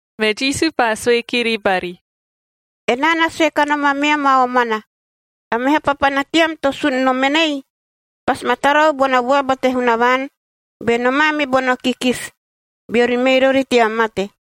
Me Jisu paa sue kiri bari, “Enaa na sue kanom ameam a omana, a meha papana team to sun nom enei, pasi ma tarau bona vuaba te Hunavaan be nomaa me bono kikisi,a beori mei rori tea mate.”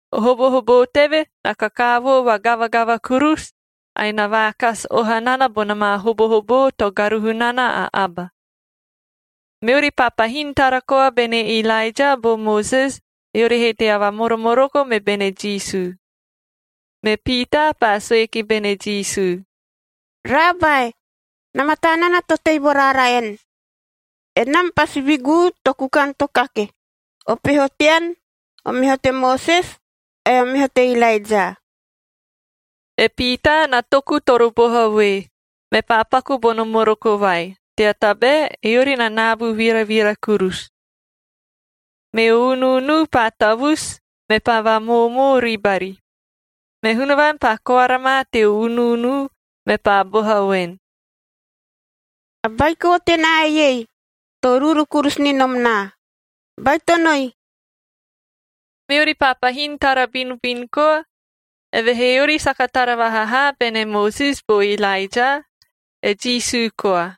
O hobohoboo teve na kakaavoo vagavagava kurusu, ae na vaakasi oha nana bona maa hobohoboo to garuhu nana a aba. Meori paa pahin tara koa bene Ilaeja bo Moses, eori he tea vamoromoroko me bene Jisu. Me Piitaa paa sue ki bene Jisu, “Raabae,b na mataa nana to tei vo raara en. Enam pasi viguu to kukan to kake:c O peho tean, o meho te Moses ae o meho te Ilaeja.” E Piitaa na toku toro boha voe, mepaa paku bono moroko vai, tea tabae eori na naabu viravira kurusu. Meo unuunu paa tavusu, mepaa vaamoomoo ribari. Me Hunavaan paa koara ma teo unuunu, mepaa boha voen, “A Baiko tenaa eiei to uruuru kurusu ni nom naa! Baitonoi!” Meori paa pahin tara binubinu koa, evehee eori saka tara vaha haa bene Moses bo Ilaeja, e Jisu koa.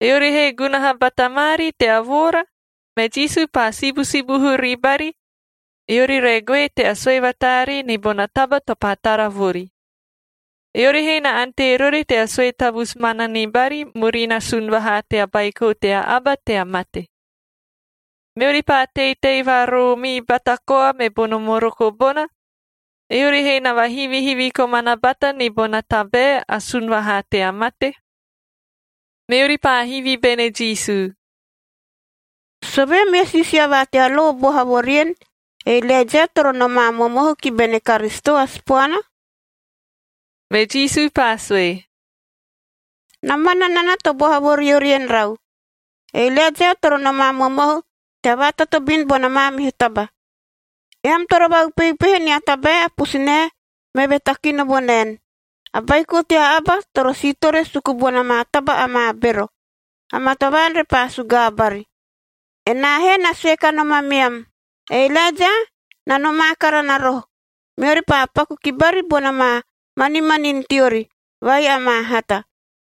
Eori he gunaha bata maari tea voora, me Jisu paa sibusibuhu ribari, eori re goe tea sue vataaree ni bona taba to paa tara vori. Eori he na ante rori tea sue tavusu mana ni bari murina sun vahaa tea Baiko tea Aba tea mate. Meori paa teitei vaaroomii bata koa me bono moroko bona, eori he na vahivihivi komana bata ni bona tabae a “sun vahaa tea mate.” Meori paa hivi bene Jisu, “Sovee meo siisia va tea lo boha vo rien, e Ilaeja toro nomaa momohu ki bene Karisito a Sipoana?” Me Jisu paa sue, “Na mana nana to boha vo riori en rau. E Ilaeja toro nomaa momohu tea vaatotobin bona maamihu taba. Eam toro vaupeupehe nia tabae a pusunae meve takino vo naen, a Baiko tea Aba toro siitore suku bona maa taba amaa bero, amaa tavaan repaa sugaa bari. Enaa he na sue kanom ameam, e Ilaeja na nomaa karana roho, meori paa paku ki bari bona maa manimanin teori vai amaa hata,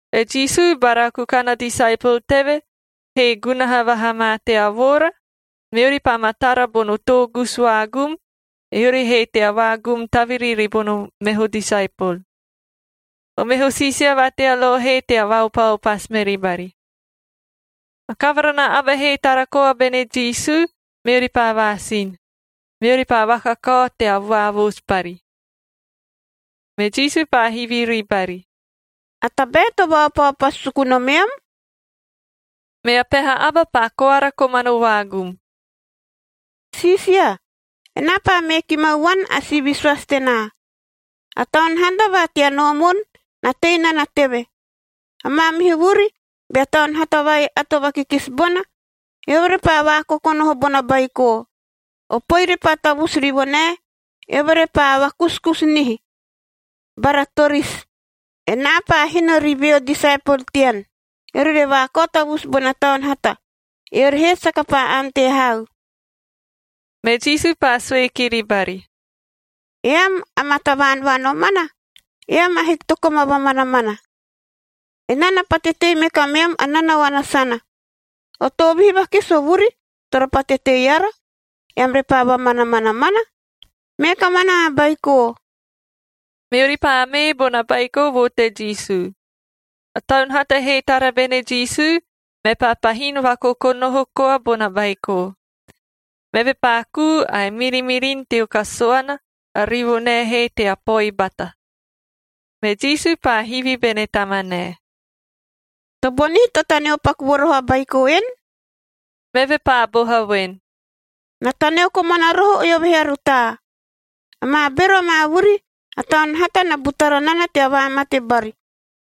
E Jisu bara kukan a disaepol teve he gunaha vaha ma tea voora, meori paa ma tara bono toogusu vaagum, eori he tea vaagum taviri ribono meho disaepol. O meho siisia va tea lo he tea vaopaopasu meri bari. A kavara na aba he tara koa bene Jisu, meori paa vaasin. Meori paa vakakao tea vaavoosu bari. Me Jisu paa hivi ribari, “A tabae to vaopaopasu suku nomeam?” Mea peha aba paa koara komano vaagum, “Siisia, enaa paa mee ki mau vuan a si visoasi tenaa. A taun hata va tea noomun na tei nana teve. A maamihu vuri, bea taun hata vai ato vakikisi bona, eove repaa vaakokonoho bona baiko. O poi repaa tavusu rivonae, eove repaa vakusukusu nihi, bara torisi. Enaa paa hino ri veo disaepol tean, eori re vaakao tavusu bona taun hata. Eori he saka paa ante hau.” Me Jisu paa sue kiri bari, “Eam, amaa tavaan va nomana, eam ahiki to koma vamanamana. Enaa na pate tei me kameam a nanaoana sana. O toovihi vakisi o vuri toro pate tei ara, eam repaa vamanamana mana? Mee kamanaa a baiko!” Meori paa mee bona baiko vo te Jisu. A taun hata he tara bene Jisu, mepaa pahin vaakokonoho koa bona baiko. Meve paa kuu ae mirimirin teo kasuana, a rivonae he tea poi bata. Me Jisu paa hivi bene tamanae, “Tobonihi to taneo paku vo roho a baiko en?” Meve paa boha voen, “Na taneo komana roho eove he a rutaa. Amaa bero amaa vuri, a taun hata na butara nana tea vaamate bari,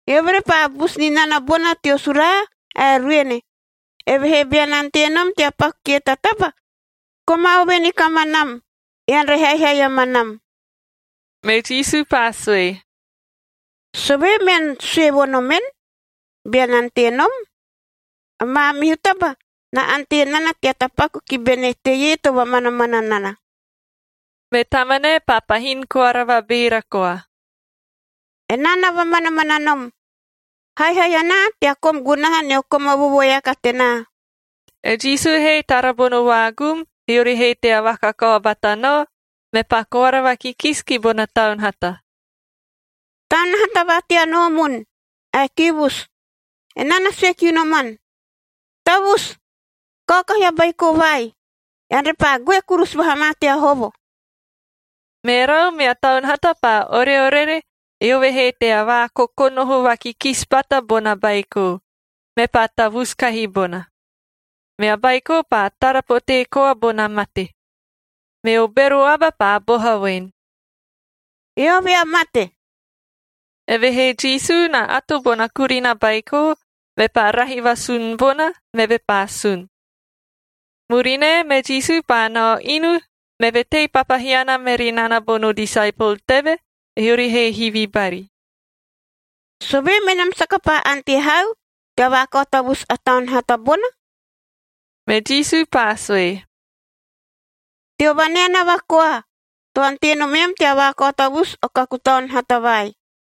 eove repaa busu ni nana bona teo suraa ae ruene. Evehee bean ante nom tea paku kie ta taba, koma ove ni kamanam, ean re haihai amanam.” Me Jisu paa sue, “Sovee mean sue vo nomen, ‘Bean ante nom’? A maamihu taba na ante nana tea tapaku ki bene teie to vamanamana nana.” Me tamanae paa pahin koara vabeera koa, “Enaa na vamanamana nom! Haihai anaa tea kom gunaha nio koma vovoeaka tenaa!” E Jisu he tara bono vaagum eori he tea vakakao bata nao, mepaa koara vakikisi ki bona taun hata, “Taun hata va tea noomun ae kiivusu, enaa na sue kiu noman: Tavusu! Kaokahi a baiko vai, ean repaa goe kurusu vaha ma tea hovo!” Merau, mea taun hata paa oreorere, eove he tea vaakokonoho vakikisi bata bona baiko, mepaa tavusu kahi bona. Mea baiko paa tara potee koa bona mate, meo bero aba paa boha voen, “Eove a mate.” Evehee Jisu na ato bona kurina baiko, mepaa rahi vasun bona, meve paa sun. Murinae, me Jisu paa nao inu, meve tei papahiana meri nana bono disaepol teve, eori he hivi bari, “Sovee menam saka paa ante hau tea vaakao tavusu a taun hata bona?” Me Jisu paa sue, “Teo vaneanava koae to ante nomeam tea vaakao tavusu o kaku taun hata vai.”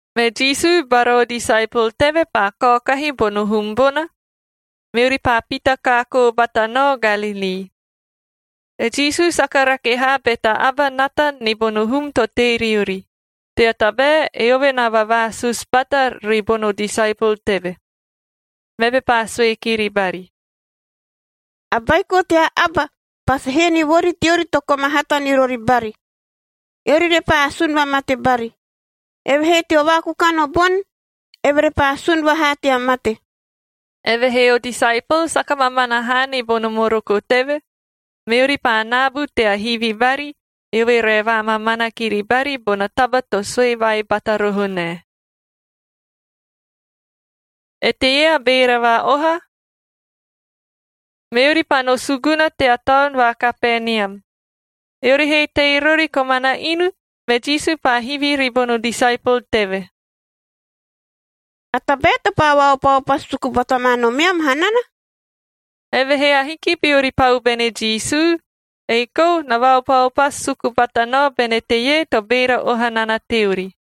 Me Jisu bara o disaepol teve paa kaokahi bono hum bona, meori paa pita kaakoo bata nao Galilii. E Jisu saka rake haa be ta aba nata ni bono hum to tei riori, tea tabae eove na vavaasusu bata ribono disaepol teve. Meve paa sue kiri bari, “A Baiko tea Aba pasi hee ni vori teori to koma hata ni rori bari, eori repaa asun vamate bari. Evehee teo vaakukan o boni, eve repaa sun vahaa tea mate.” Evehee o disaepol saka mamana haa ni bono moroko teve, meori paa naabu tea hivi bari, eove re vaamamana kiri bari bona taba to sue vai bata roho nae. Eteie a beera va-oha? Meori paa no suguna tea taon va Kapenium. Eori he tei rori komana inu, me Jisu paa hivi ribono disaepol teve, “A tabae to paa vaopaopasu suku bata ma nomeam hanana?” Evehee ahiki beori pau bene Jisu, ei kou na vaopaopasu suku bata nao bene teie to beera oha nana teori.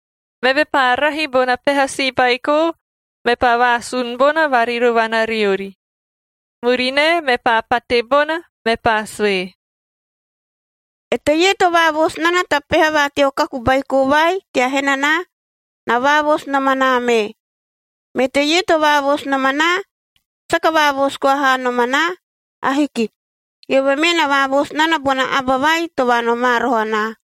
Meve paa rahi bona peha si baiko, mepaa vaasun bona varirovana riori. Murinae, mepaa pate bona, mepaa sue, “Eteie to vaavoosu nana ta peha va teo kaku baiko vai tea henanaa na vaavoosu nom anaa mee. Me teie to vaavoosu nom anaa, saka vaavoosu koa haa nom anaa. Ahiki. Eove mee na vaavoosu nana bona Aba vai to vaanomaa roho anaa.”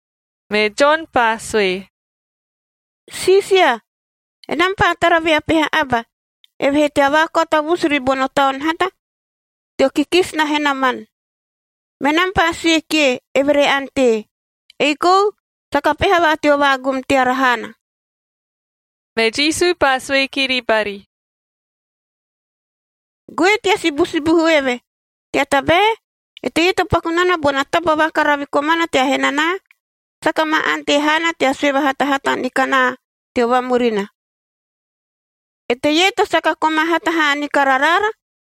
Me Jon paa sue, “Siisia, enam paa tara vea peha aba, eve he tea vaakao tavusu ribono taun hata teo kikisi na henaman. Menam paa sue kie, eve re ante, ei kou saka peha va teo vaagum teara haana.” Me Jisu paa sue kiri bari, “Goe tea sibusibuhu eve, tea tabae eteie to paku nana bona taba vakaravi komana tea henanaa, saka ma ante haana tea sue vahatahata ni kanaa teo vamurina. Eteie to saka koma hata haa ni kara raara,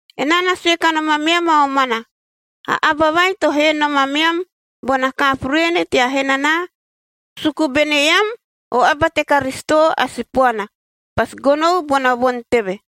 Enaa na sue kanom ameam a omana, a aba vai to hee nom ameam bona kaapu ruene tea henanaa, suku bene eam o aba te Karisito a Sipoana, pasi gonou bona voni teve.”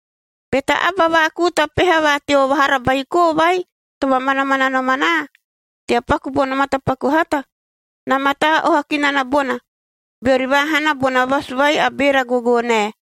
“Be ta aba vaakuu ta peha va teo vahara baiko vai to vamanamana nom anaa, tea paku bono matapaku hata, na mataa oha ki nana bona, beori vaahana bona vasu vai a beera gogoonae,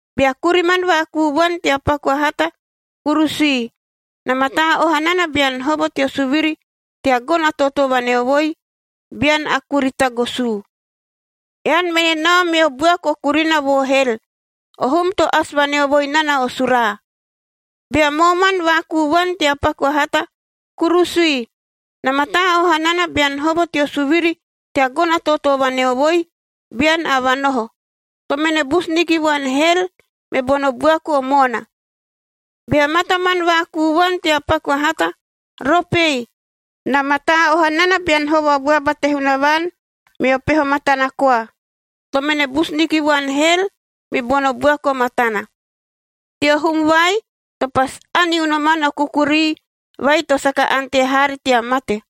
Bea kuriman vaakuu vuan tea paku a hata, kurusui.h Na mataa oha nana bean hovo teo suviri tea gono a tootoo vaneovoi, bean a kuri tagosuu. Ean mene nao meo buaku o kurina vo hel, o hum to asi vaneovoi nana o suraa. i Bea mooman vaakuu vuan tea paku a hata, kurusui. Na mataa oha nana bean hovo teo suviri tea gono a tootoo vaneovoi, bean a vanoho. To mene busu ni ki vuan hel me bono buaku o moona. j Bea mataman vaakuu vuan tea paku a hata, ropei. Na mataa oha nana bean hovo a vuaba te Hunavaan meo peho matana koa. To mene busu ni ki vuan hel mi bono buaku o matana, teo hum vai to ‘pasi ani unoman o kukurii vai to saka ante haari tea mate,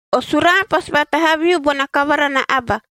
“O suraa pasi vatahaviu bona kavara na aba,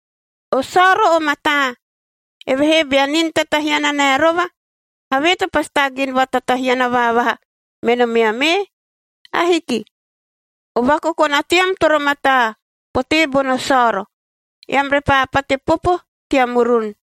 O saoro o mataa, evehee bea nin tatahiana nae rova, havee to pasi taagin vaatatahiana vaavaha me nomeam ee? Ahiki. O vakokona team toro mataa potee bono saoro, eam repaa pate popo tea murun.m”